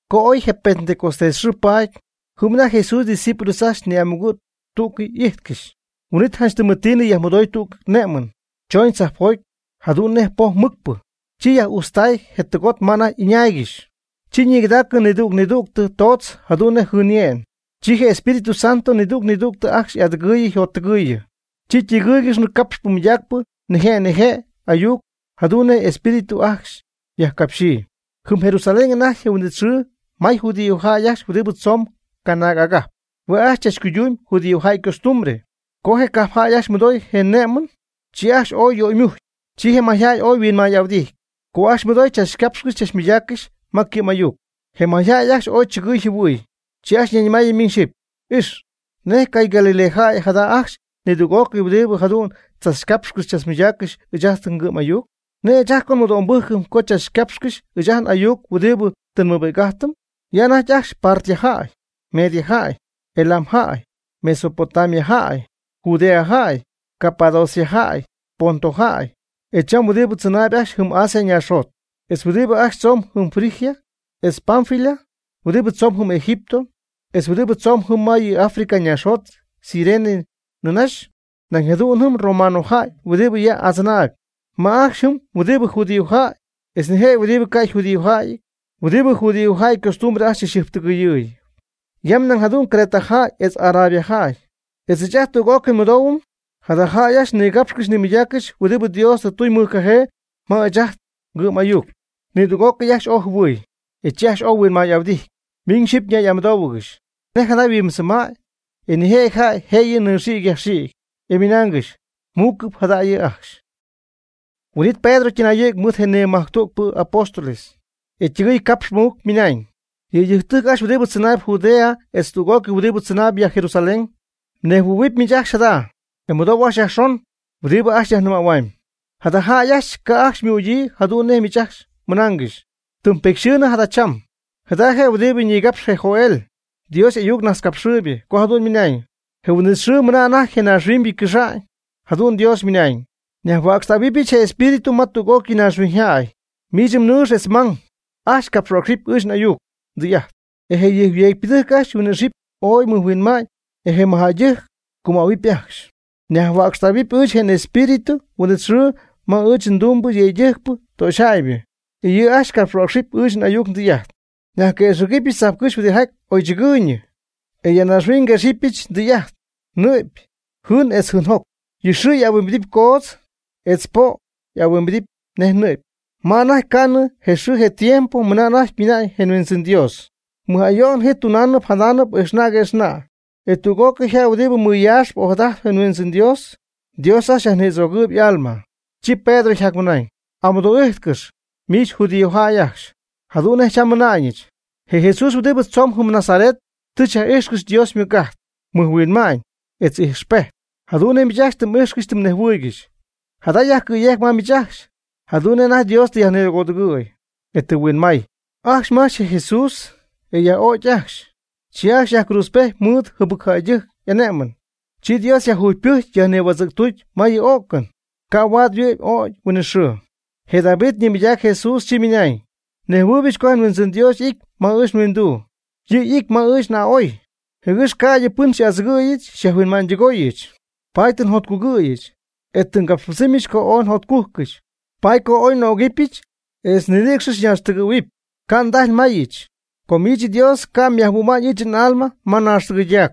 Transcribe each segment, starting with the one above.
Co oy je Pentecostés xɨɨ paady, jɨm anajty Jesús ydiscípulos ajcxy ni'amugɨ' tú'cɨy ijtcɨxy. Huin'it janch tɨmɨtiinɨ yajmɨdoy tüg ne'mɨn, choñ tzajpjoty, jadu'n nej poj mɨcpɨ. Chi yaj'ujtztaay je tɨgot ma anajty ɨñaaygɨxy. Chi nigɨdaacɨ nidüg nidügtɨ toodz jadu'n nej jɨɨnye'n. Chi je Espíritu Santo nidüg nidügtɨ ajcxy y'adɨgɨɨyɨ yjottɨgɨɨyɨ. Chi ytɨgɨ́ɨygɨxnɨ capxy mɨydaacp nije' nije' ayuc jadu'n nej je Espíritu ajcxy yajcapxyii. Jɨm Jerusalén anajty je huin'it xɨɨ may judíojäy ajcxy huɨdibɨ tzoomb canaag agajp. Hue' ajcxy chachcuydumb judíojäy ycostumbre. Co je cajpjäy ajcxy mɨdooy je ne'mɨn, chi ajcxy ooy yöymujcy. Chi je mayjäy ooy yhuinmay'ahuɨdijty, co ajcxy mɨdooy chachcapxcɨxy chachmɨydaaccɨxy ma ycɨ'm'ayuc. Je mayjäy ajcxy ooy chɨgɨɨy jɨhuɨɨy, chi ajcxy ñayñɨmaayɨ miñ xyɨpy: ―Ix ¿nej cay Galilea jäy jada ajcxy nidüg'ócɨy huɨdibɨ jadu'n tzachcapxcɨxy tzachmɨydaaccɨxy ɨɨch ajt ngɨ'm'ayuc? ¿Nej ɨɨch ajt co nmɨdo'mbɨ́jcɨm co tzachmɨydaaccɨxy ɨɨch ajt n'ayuc huɨdibɨ tɨ nmɨbi'c'ájtɨm? Ya anajty ajcxy Partia jäy, Media jäy, Elam jäy, Mesopotamia jäy, Judea jäy, Capadocia jäy, Ponto jäy, etz cham huɨdi tzɨnaayb ajcxy jɨm Asia ñaaxjot, etz huɨdibɨ ajcxy tzomb jɨm Frigia, etz Panfilia, huɨdibɨ tzomb jɨm Egipto, etz huɨdibɨ tzomb jɨm ma yɨ Africa ñaaxjot Cirene nïnaxy. Nañ jadu'n jɨm romanojäy huɨdibɨ ya adzɨnaayb. May ajcxy jɨm huɨdibɨ judíojäy etz nijëjɨty huɨdibɨ ca' yjudíojäyɨty huɨdibɨ judíojäy ycostumbre ajcxy tɨ yjɨjptɨgɨyɨɨyɨ. Ya nañ jadu'n Creta jäy etz Arabia jäy; e ɨɨch ajt tüg'ócɨy nmɨdoohuɨm jada jäy ajcxy nigapxcɨxy nimɨydaaccɨxy huɨdi Dios tɨ tuñ mɨjcajee ma ɨɨch ajt ngɨ'm'ayuc. Nidüg'ócɨy ajcxy ooy jɨhuɨ̈y, e chi ajcxy ooy yhuinmay'ahuɨdijty, miñ xyɨpy ñay'amɨdóohuɨgɨxy: ―¿Nej jada yhuimbɨdzɨma'ñ? E nijëjɨty jäy jëyɨ nɨxïgy yajxïgy, ymɨnaangɨxy: ―Muucɨp jada yɨ' ajcxy. Huin'it Pedro ytɨnayɨ̈gy mɨɨd je nimajctügpɨ apóstoles, e ytɨgɨɨy capxpɨ mɨc ymɨnañ: ―Yëydɨjctɨjc ajcxy huɨdibɨ tzɨnaayb Judea etz tüg'ócɨy huɨdibɨ tzɨnaayb ya Jerusalén, nejhuɨ̈huɨpy miich ajcxy jada e mɨdou ajcxy yajxon huɨdibɨ ajcxy nyajnɨmähuamyb. Jada jäy ajcxy ca' ajcxy ymügyii jadu'n nej miich ajcxy mɨnaangɨxy. Tɨm petyxɨɨnɨ jada cham. Jada je' huɨdibɨ ñigapxy je Joel, Dios y'ayuc najtzcapxɨɨybɨ, co jadu'n mɨna'ñ: Je huin'it xɨɨ mɨna anajty je naaxhuiñybɨ cɨxa'ñ, jadu'n Dios mɨnañ, nyajhuäcxtähuɨbɨch je nEspíritu ma tüg'ócɨy naaxhuiñyjäy. Miich mnɨɨx etz mmang ajcxy capxhuäcxɨp ɨɨch n'ayuc ndɨy'ajt, e je yujcyeecpɨdɨjc ajcxy yhuin'ixɨpy ooy mɨjhuinma'ñ, e je mɨjjäydɨjc cumähuɨpy ajcxy. Nyajhuäcxtähuɨp ɨɨch je nEspíritu huin'it xɨɨ ma ɨɨch ndumbɨ yëydɨjcpɨ töxyjäybɨ, e yɨ' ajcxy capxhuäcxɨp ɨɨch n'ayuc ndɨy'ajt. Nyajquëxɨ̈gɨbɨch tzajpcɨ́xy huɨdijaty oy chɨgɨɨyñɨ, e ya naaxhuiñ nyegɨpyɨch tɨy'ajt: nɨ'py, jɨɨn etz jɨɨnjoc. Yɨ xɨɨ ahuimbidɨpy coodz, etz je po' ahuimbidɨpy nej nɨ'py, ma anajty ca' miñ je xɨɨ je tiempo mɨna anajty mina'ñ je Huindzɨn Dios. Mɨj ayo'n ji tunaanɨp jadaanɨp ijxna' quëxna'. E tüg'ócɨy jäy huɨdi mɨyaaxp ojadajtp je Huindzɨn Dios, Dios ajcxy yajnïdzögɨɨb y'alma. Chi Pedro yjacmɨnañ: ―Amɨdo'ijtcɨx, miich judíojäy ajcxy, jadu'n nej cham nmɨna'na'ñɨch. Je Jesús huɨdibɨ tzoon jɨm Nazaret tɨ xyaj'ijxcɨxy Dios ymɨc'ajt, mɨjhuinma'ñ, etz ijxpejt, jadu'n nej miich ajcxy tɨ m'ijxcɨxy tɨ mnejhuɨɨygɨxy. Jada yajcɨ̈yejc ma miich ajcxy, jadu'n nej anajty Dios tɨ yajnigödugɨ̈y, e tɨ huinmay. Ajcxy mmajch je Jesús e myaj'ögy ajcxy, chi ajcxy myajcruudzpejty mɨɨd jɨbɨc jäydɨjc y'ané'mɨn. Chi Dios yajjugypɨjcy yajnïhuädzɨ̈ctuty ma yɨ ó'cɨn, ca' huaad yhuɨ'my ögy huinɨxɨɨ. Je David ñimɨydac Jesús chi ymɨnañ: Nejhuɨɨybɨch co je nHuindzɨn Dios y'ity ma ɨɨch nhuinduu. Yɨ' ijt ma ɨɨch n'a'oy, jɨgɨx ca'ydɨ pɨn xy'adzɨgɨ̈yɨch xyajhuinma'ñydɨgooyɨch. Paady tɨ njotcugɨ̈yɨch, e tɨ ngapxypɨdzɨmyɨch co ooy njotcujcɨch. Paady co oy n'ögɨbɨch etz ninïcx ñaaxtɨgɨ̈huɨpy, ca' ndajy mayɨch. Co miich Dios ca' myajhuɨ'ma'ñ ɨɨch n'alma ma ñaaxtɨgɨydac.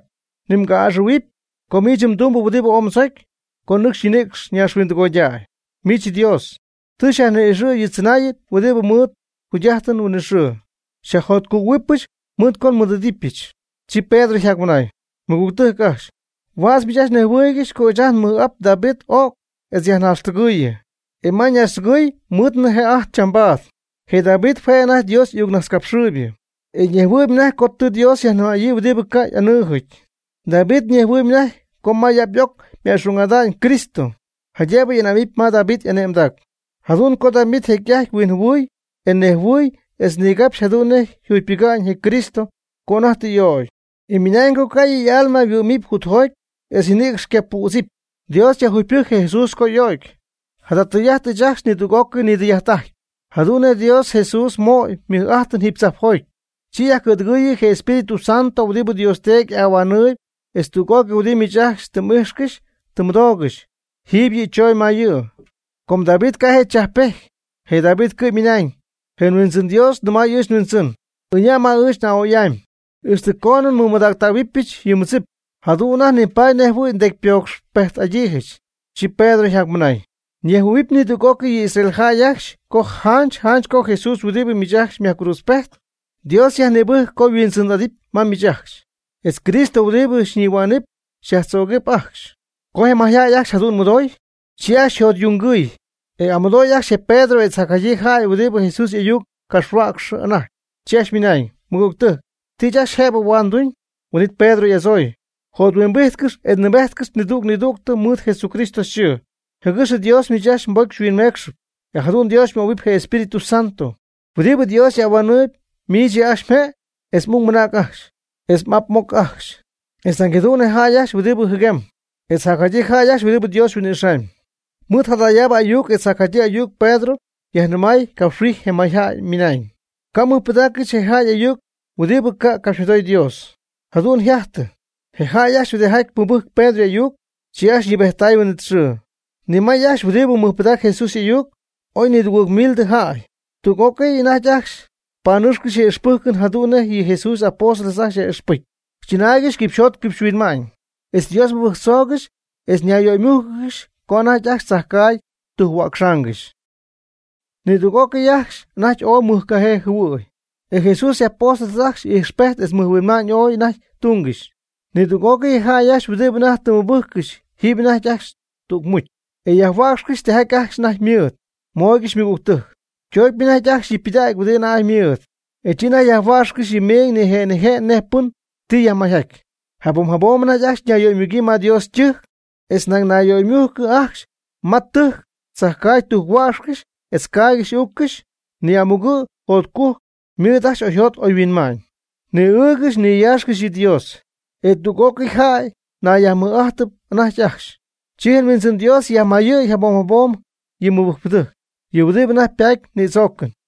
Ni mga'aa'ɨxɨ̈huipy, co miich mdumbɨ huɨdibɨ ooy mdzocy, co nɨcxy ñinïcx ñaaxhuindɨgoydäy. Miich Dios, tɨ xyajni'ixɨ̈yɨch yɨ tzɨnaayɨn huɨdibɨ ymɨɨd jugy'ájtɨn huinɨxɨɨbɨ. Xyajjotcugɨ̈huɨbɨch mɨɨd co xymɨɨd'idɨpyɨch. Chi Pedro yjacmɨnañ: ―Mɨgügtɨjc ajcxy, huädz miich mnejhuɨɨygɨxy co ɨɨch ajt nmɨj'ap David y'o'cy etz yajnaaxtɨgɨɨyɨ. E ma ñaaxtɨgɨɨy nmɨɨdnɨ jë'ajt chambaad. Je David hue' je' anajty Dios y'ayuc ñajtzcapxɨɨybɨ, e ñejhuɨɨyb anajty co tɨ Dios yajnɨmäyii huɨdibɨ ca' y'anɨɨjɨty. David ñejhuɨɨyb anajty co ma y'ap y'oc ma'xung'adɨpy Cristo, jaydëbɨ ané'mɨpy ma David y'ane'mdac. Jadu'n co David jecy'ajty huinjɨhuɨɨy e nejhuɨɨy etz nigapxy jadu'n nej yjugypɨga'ñ je Cristo co anajty tɨ y'ögy. E ymɨnañ co ca' yɨ' y'alma yhuɨ́'mɨpy jutjoty etz ñinïcx ca' ypüdzɨpy. Dios yajjugypɨjcy je Jesús co y'o'cy. Jada tɨy'ajt ɨɨch ajcxy nidüg'ócɨy nidɨy'ajt'ajtpy. Jadu'n Dios Jesús mooy mɨj'ajt jiiby tzajpjoty, chi yajcɨ̈dɨgɨɨyɨ je Espíritu Santo huɨdibɨ Dios Teedy y'ahuanɨɨy e tüg'ócɨy huɨdibɨ miich ajcxy tɨ m'ijxcɨxy tɨ mmɨdoogɨxy jiiby yɨ' chooñ ma yɨ'. Com David ca' je' chajppejty, je David cɨ'm ymɨnañ: Je Huindzɨn Dios nɨmay ɨɨch nHuindzɨn: “Ɨña' ma ɨɨch a'oy'amy, ixtɨ coonɨ nmɨmadactähuɨbɨch yɨ mmɨdzip, jadu'n anajty nipaady nej jɨhuɨ̈y mdecypocxpejt'adyii.” Chi Pedro yjacmɨnañ: ―Ñejhuɨ̈huɨpy nidüg'ócɨy yɨ Israel jäy ajcxy co janch janch co je Jesús huɨdibɨ miich ajcxy myajcruudzpejt, Dios yajnïbɨjc co yhuindzɨn'adɨpy ma miich ajcxy, etz Cristo huɨdibɨ xyñihua'nɨpy xyajtzögɨpy ajcxy. Co je mayjäy ajcxy jadu'n mɨdoy, chi ajcxy yjotyungɨɨy, e amɨdoy ajcxy je Pedro etz jacjadyii jäy huɨdi Jesús y'ayuc capxhuäcxɨ anajty, chi ajcxy ymɨnañ: ―Mɨgügtɨjc, ¿ti ɨɨch ajcxy jëbɨ huaad nduñ? Huin'it Pedro y'adzooy: ―Jothuimbijtcɨx e nɨɨbejtcɨx nidüg nidüg mɨɨd Jesucristo yxɨɨ, jɨgɨx Dios miich ajcxy mbocy xyhuinmeecxɨpy. E jadu'n Dios xymöhuɨpy je Espíritu Santo. Huɨdibɨ Dios y'ahuanɨɨy miich yɨ' ajcxy mje' etz m'ung ajcxy, etz m'ap m'oc ajcxy, etz nañ jadu'n je jäy ajcxy huɨdi jɨguémɨp, etz jacjadyii jäy ajcxy huɨdi Dios huin'ixamy. Mɨɨd jadayaab ayuc etz jacjadyii ayuc Pedro yajnɨmay capxhuijy je mayjäy ymɨnañ: ―Ca' mmɨjpɨdaaccɨx je jäy ajcxy y'ayuc huɨdibɨ ca' capxymɨdoy Dios. Jadu'n yjajtɨ, je jäy ajcxy huɨdijaty mɨbɨjc Pedro y'ayuc, chi ajcxy ñɨɨbejttay huin'it xɨɨ. Ñimayɨɨy ajcxy huɨdibɨ mɨjpɨdac Jesús y'ayuc oy nidugɨɨg mildɨ jäy. Tüg'ócɨy ajcxy anajty panɨcxcɨxy yɨ ixpɨ́jcɨn jadu'n nej yɨ Jesús y'apóstoles ajcxy yaj'ixpɨjcy. Chɨnaaygɨxy yquipxyjot yquipxyhuinma'ñ. Etz Dios mɨbɨjctzoogɨxy e ñayyöymújcɨgɨxy co anajty ajcxy chajcaagy tujc-huäcxaangɨxy. Nidüg'ócɨy ajcxy anajty ooy mɨjcajee jɨhuɨɨy. E Jesús y'apóstoles ajcxy ijxpejt etz mɨjhuinma'ñ ooy anajty tungɨxy. Nidüg'ócɨy je jäy ajcxy huɨdibɨ anajty tɨ ymɨbɨjccɨxy ijtp anajty ajcxy tüg mucy, e yajhuäcxcɨxy tijaty ajcxy anajty ymɨɨd, mooygɨxy ymɨgügtɨjc. Ytoocpy anajty ajcxy yɨ' ypɨdägy huɨdibɨ anajty ymɨɨd, e chi anajty yajhuäcxcɨxy yɨ meeñ nije' nije' nej pɨn ti yajmayjaty. Jabom jabom anajty ajcxy ñayyöymugyii ma Dios ytɨjc, etz nañ ñayyöymugyii ajcxy ma ytɨjc tzajcaagy tujc-huäcxcɨxy etz ycaaygɨxy y'uuccɨxy ni'amugɨ' jotcujc mɨɨd ajcxy y'oyjot y'oyhuinma'ñ. Ñi'ɨɨgɨxy niyaaxcɨxy yɨ Dios, e tüg'ócɨy jäy nayyajmɨj'ájtɨp anajty ajcxy. Chi je Huindzɨn Dios yajmayɨ̈y jabom jabom yɨ mɨbɨjcpɨdɨjc, yɨ' huɨdibɨ anajty patp nïdzoocɨn.